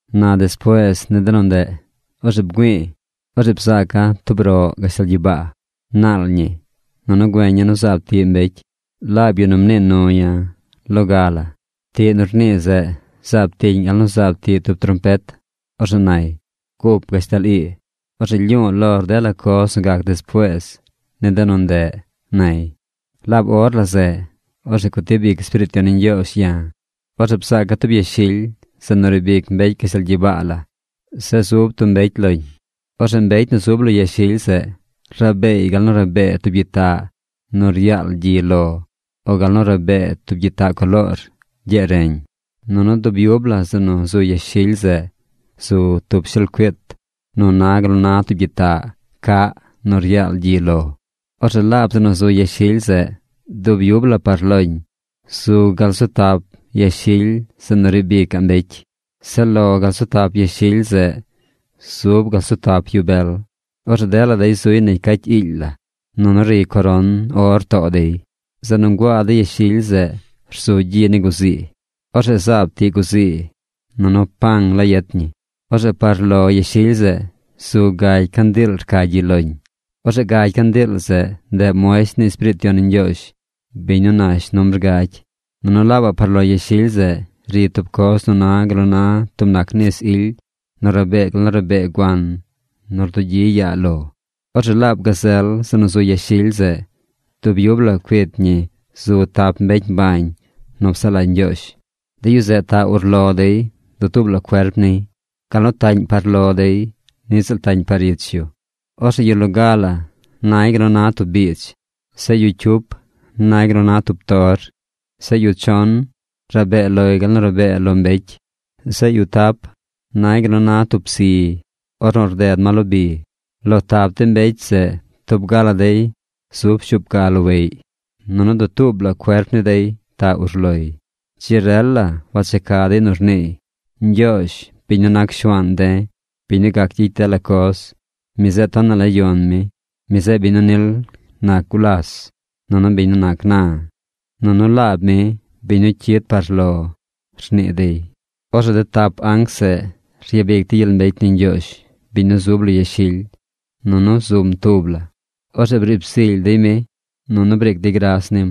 Na despuees ni de nu ndeꞌ, orzeꞌ bgüi̱i̱. Orzeꞌ bzaaca̱ tub roꞌ gashtal gyibaa. Naal ñi. Nunu güeña̱ nu zaab tiꞌ mbecy, laab yu nu mnii nu ya̱ loga. Tiꞌ nu rnii zeꞌ zaab tiꞌñ gal nu zaab tiꞌ tub trompet. Orzeꞌ nay: ―Gup gashtal ii. Orzeꞌ lyu̱u̱ lor dela coz nu gac despuees ni de nu ndeꞌ ―nay. Laab or la zeꞌ, orzeꞌ gutib ic Espiriit Yon ni Ñgyoozh ya̱. Orzeꞌ bzaaca̱ tub yashily zeꞌ nu riib ic mbecy gashtal gyibaa la. Zeꞌ zub tub mbecy loñ. Orzeꞌ mbecy nu zub lo yashily zeꞌ rabeey gal nu rabee tub gyitaꞌ nu ryaal gyi lo o gal nu rabee tub gyitaꞌ coloor gyee reñ. Nunu dub yub la zeꞌ nu zu yashily zeꞌ zu tub shelcuit nu na gal nu na tub gyitaꞌ caꞌ nu ryaal gyi lo. Orzeꞌ laab zeꞌ nu zu yashily zeꞌ dub yub la par loñ, zu gaꞌ gal zu tap yashily zeꞌ nu riib icaꞌ mbecy. Zeꞌ lo gal zu tap yashily zeꞌ, zub gal zu tap yu bel. Orzeꞌ dela dey zuy negy cacy iily la, nunu ri coron or too dey. Zeꞌ nu nguaa de yashily zeꞌ rzu gyi ni guzii. Orzeꞌ zaab tiꞌ guzii, nunu pang la yet ñi. Orzeꞌ par lo yashily zeꞌ zu gagy candiil rca gyi loñ. Orzeꞌ gagy candiil zeꞌ, ndeꞌ muesht ni Espiriit Yon ni Ñgyoozh, biñ nu nash numbr gagy. Nunu laabaꞌ par lo yashily zeꞌ ri tub coz nu na gal nu na tub nac nis ily, nu rabee gal nu rabee guan nu rdugyi yaa lo. Orzeꞌ laab gazel zeꞌ nu zu yashily zeꞌ, dub yub la cuit ñi zu tap mbecy mbañ nu psaꞌ lagy Ñgyoozh. De yu zeꞌ taꞌ urlo dey dutuub la cuerp niy. Gal nu taꞌñ par lo dey niꞌ ziꞌl taꞌñ par ich yu. Orzeꞌ yu loga la nay gal nu na tub biidz. Zeꞌ yu cyup nay gal nu na tor. Zeꞌ yu chon rabee loy gal nu rabee lo mbecy. Zeꞌ yu tap nay gal nu na tub psi ornu rded ma lo bi. Lo tap de mbecy zeꞌ tub ga la dey zub shuup ga loweꞌy. Nunu dutuub la cuerp ni dey taꞌ urloy. Dzi rel la wacheca dey nu rniiy: Ñgyoozh, biñ nu nac Shuaan de̱, biñ nu gac gyicy dela coz, mi zeꞌ tonaꞌ la yon mi. Mi zeꞌ biñ nu nil nac gulas, nunu biñ nu nac na, nunu laab mi biñ nu cyid par lo, rnii dey. Orzeꞌ de tap anc zeꞌ ryabic dey gyel mbecy ni Ñgyoozh, biñ nu zub lo yashily, nunu zum tub la. Orzeꞌ briib zily dey mi, nunu briic dey gras nim.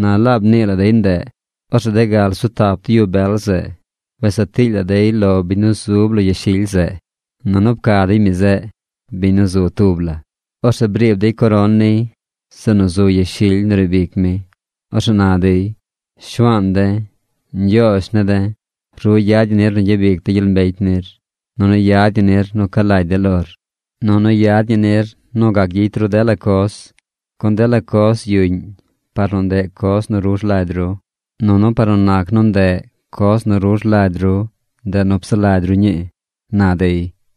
Na laab mnii la dey ndeꞌ, orzeꞌ de gal zu tap yu bel zeꞌ wes saa tiily la dey lo biñ nu zub lo yashily zeꞌ. Nunu pca dey mi zeꞌ, biñ nu zu tub la. Orzeꞌ briib dey coron niy zeꞌ nu zu yashily nu riib ic mi. Orzeꞌ na dey: Shuaan de̱, Ñgyoozh ne̱ de̱, ru yad ñi nir nu gyabic de̱ gyel mbecy nir, nunu yad ñi nir nu ca lagy de̱ lor, nunu yad ñi nir nu gac gyicy ru dela coz, gun dela coz yuꞌñ par nu ndeꞌ coz nu ru rlagy ru. Nunu par nu nac nu ndeꞌ coz nu ru rlagy ru, ndeꞌ nu psaꞌ lagy ru ñii, na dey.